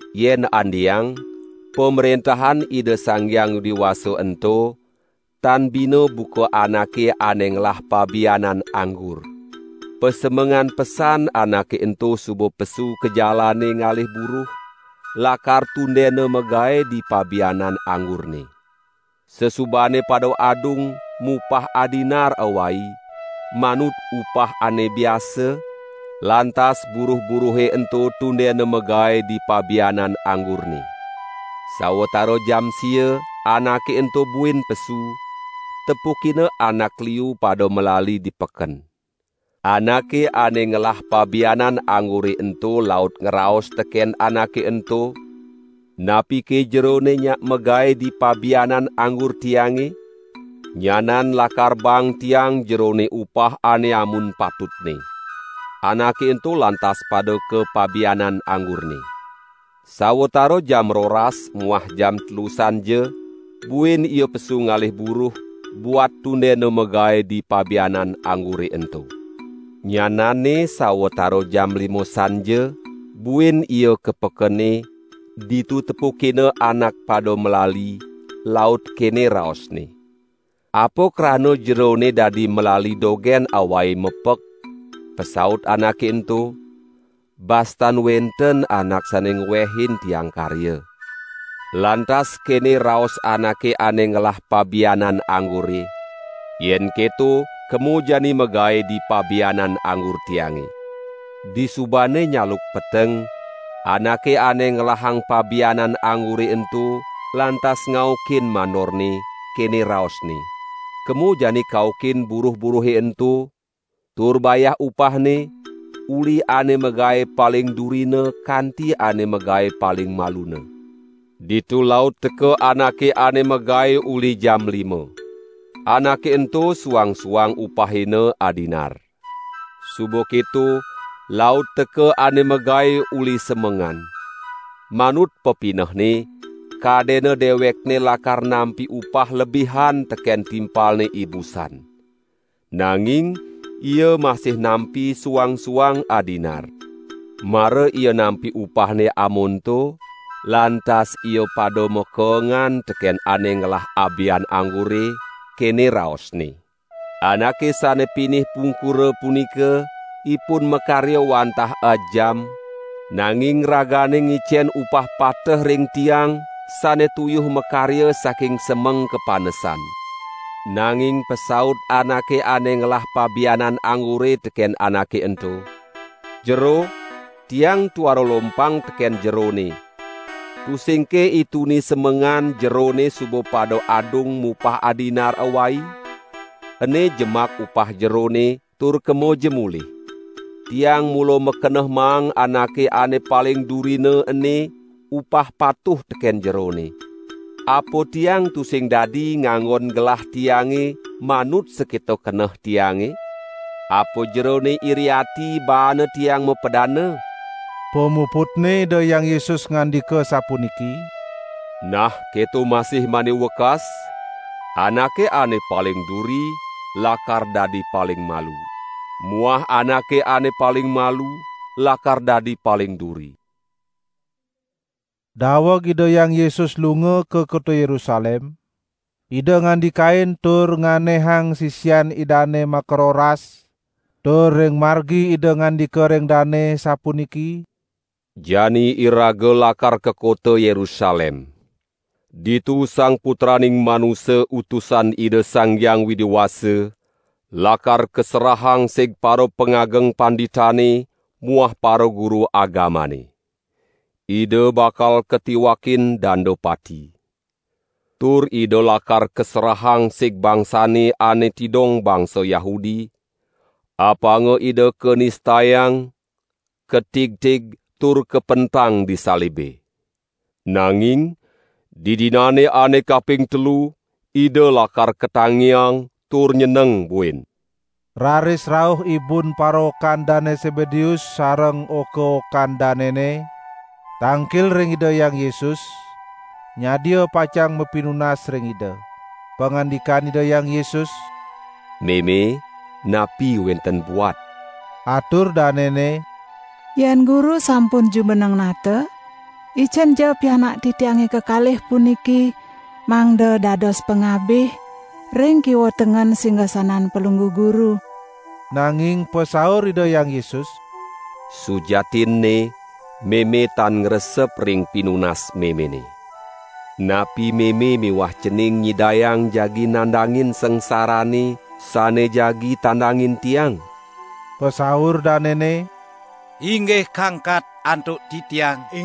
"Yen andeang Pamrentahan Ida Sang Hyang Widi Wasa ento tan bina buka anake ane ngelah pabianan anggur. Pasemengan pesan anake ento suba pesu ka jalane ngalih buruh, lakar tundena magae di pabianan anggurne. Sasubane pada adung mupah adinar awai, manut upah ane biasa, lantas buruh-buruhe ento tundena magae di pabianan anggurne. Sawatara jam sia anake ento buin pesu, tepukina anak liu pada malali di peken. Anake ane ngelah pabianan anggure ento laut ngraos teken anake ento: 'Napike jerone nyak magae di pabianan anggur tiange? Nyanan lakar baang tiang jerone upah ane amun patutne.' Anake ento lantas pada ka pabianan anggurne. Sawatara jam roras muah jam telu sanja, buin ia pesu ngalih buruh, buat tundena magae di pabianan anggure ento. Nyananne sawatara jam lima sanja, buin ia ka pekene ditu tepukina anak pada malali, laut kene raosne: 'Apa krana jerone dadi malali dogen awai mepek?' Pasaut anake ento: 'Bas tan wenten anak sane ngwehin tiang karya.' Lantas kene raos anake ane ngelah pabianan anggure: 'Yen keto kemo jani magae di pabianan anggur tiange.' Disubane nyaluk peteng, anake ane ngelahang pabianan anggure ento lantas ngaukin mandorne, kene raosne: 'Kemo jani kaukin buruh-buruhe ento, tur bayah upahne, uli ane magae paling durina kanti ane magae paling maluna.' Ditu laut teka anake ane magae uli jam lima. Anake ento suang-suang upahina adinar. Suba keto laut teka ane magae uli semengan. Manut pepinehne, kadena dewekne lakar nampi upah lebihan teken timpalne ibusan. Nanging ia masih nampi suang-suang adinar. Mara ia nampi upahne amonto, lantas ia pada makeengan teken ane ngelah abian anggure, kene raosne: 'Anake sane pinih pungkura punika, ipun makarya wantah ajam, nanging ragane ngicen upah pateh ring tiang sane tuyuh makarya saking semeng kapanesan.' Nanging pasaut anake ane ngelah pabianan anggure teken anake ento: 'Jero, tiang tuara lompang teken jerone. Tusingke ituni semengan jerone suba pada adung mupah adinar awai? Ene jemak upah jerone tur kemoja mulih! Tiang mula makeneh maang anake ane paling durina ene upah patuh teken jerone. Apa tiang tusing dadi nganggon gelah tiange manut sakita keneh tiange? Apa jerone iri ati baane tiang mapadana?' " Pamuputne Ida Hyang Yesus ngandika sapuniki: "Nah keto masih mani wekas, anake ane paling duri, lakar dadi paling malu; muah anake ane paling malu lakar dadi paling duri." Daweg Ida Hyang Yesus lunga ka kota Yerusalem, Ida ngandikain tur nganehang sisian Idane makaroras, tur ring margi Ida ngandika ring dane, sapuniki: "Jani iraga lakar ka kota Yerusalem. Ditu Sang Putraning Manusa Utusan Ida Sang Hyang Widi Wasa lakar kaserahang sig parapangageng panditane muah paraguru agamane. Ida bakal katiwakin danda pati. Tur Ida lakar kaserahang sig bangsane ane tidong bangsa Yahudi, apanga Ida kanistayang, katigtig tur kapentang di salibe. Nanging di dinane ane kaping telu Ida lakar katangiang tur nyeneng buin." Raris rauh ibun paraokan Dane Sebedeus sareng oka-okan danene, tangkil ring Ida Hyang Yesus nyadia pacang mapinunas ring Ida. Pangandikan Ida Hyang Yesus: "Meme, napi wenten buat?" Atur danene: "Yen Guru sampun jumeneng nata, icenja pianak titiange kekalih puniki mangda dados pangabih ring kiwa tengen singasanan Palungguh Guru." Nanging pasaur Ida Hyang Yesus: "Sujatinne meme tan ngresep ring pinunas memene. Napi meme miwah cening nyidayang jagi nandangin sangsarane sane jagi tandangin Tiang?" Pasaur danene: "Inggih kangkat antuk titiang."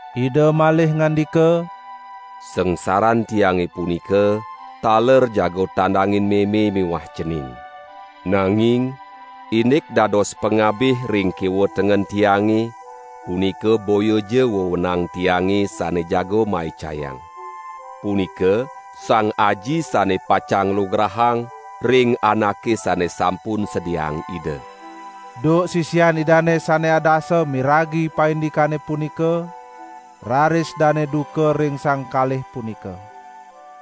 Ida malih ngandika: "Sangsaran Tiange punika taler jaga tandangin meme miwah cening. Nanging indik dados pangabih ring kiwa tengen Tiange punika boyaja wewenang Tiange sane jaga maicayang. Punika Sang Aji sane pacang nglugrahang ring anake sane sampun sediaang Ida." Duk sisian Idane sane adasa miragi paindikane punika, raris dane duka ring sang kalih punika.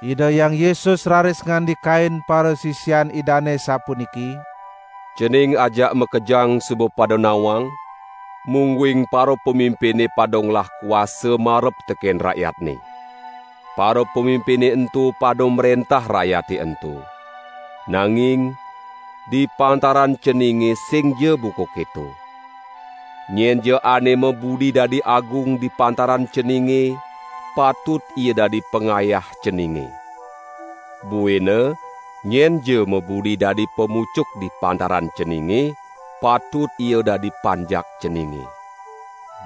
Ida Hyang Yesus raris ngandikain parasisian Idane sapuniki: "Cening ajak makejang suba pada nawang, mungguing parapamimpine pada ngelah kuasa marep teken rakyatne. Parapamimpine ento pada mrentah rakyate ento. Nanging di pantaran ceninge singja buka keto. Nyenja ane mabudi dadi agung di pantaran ceninge, patut ia dadi pangayah ceninge. Buina nyenja mabudi dadi pamucuk di pantaran ceninge, patut ia dadi panjak ceninge.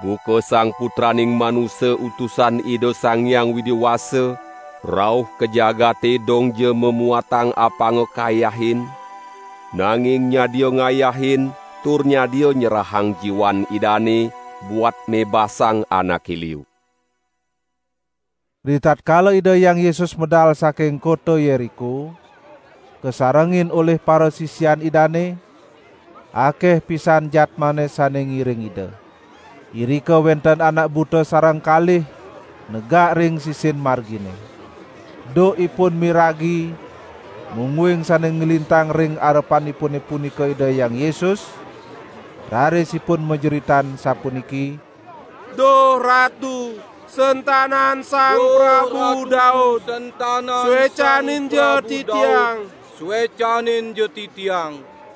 Buka Sang Putraning Manusa Utusan Ida Sang Hyang Widi Wasa rauh ka jagate dongja mamuatang apanga kayahin, nanging nyadia ngayahin tur nyadia nyerahang jiwan Idane buat mebasang anake liu." Ritatkala Ida Hyang Yesus medal saking kota Yeriko, kasarengin olih parasisian Idane, akeh pisan jadmane sane ngiring Ida. Irika wenten anak buta sareng kalih negak ring sisin margine. Duk ipun miragi mungguing sane nglintang ring arepanipune punika Ida Hyang Yesus, raris ipun majeritan sapuniki: "Duh Ratu, sentanan Sang Prabu Daud, suecaninja titiang!"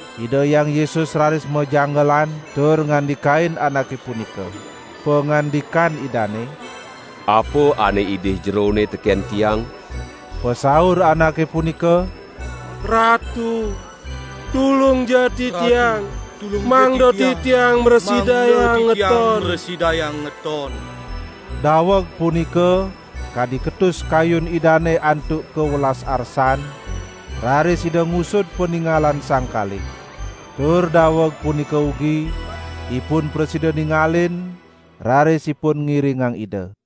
Ida Hyang Yesus raris majanggelan tur ngandikain anake punika. Pangandikan Idane: "Apa ane idih jerone teken Tiang?" Pasaur anake punika: "Ratu, tulungja titiang, mangda titiang mrasidayang ngeton." Daweg punika kadi ketus kayun Idane antuk kawelas arsan, raris Ida ngusud paningalan sang kalih. Tur daweg punika ugi ipun prasida ningalin raris ipun ngiringang Ida.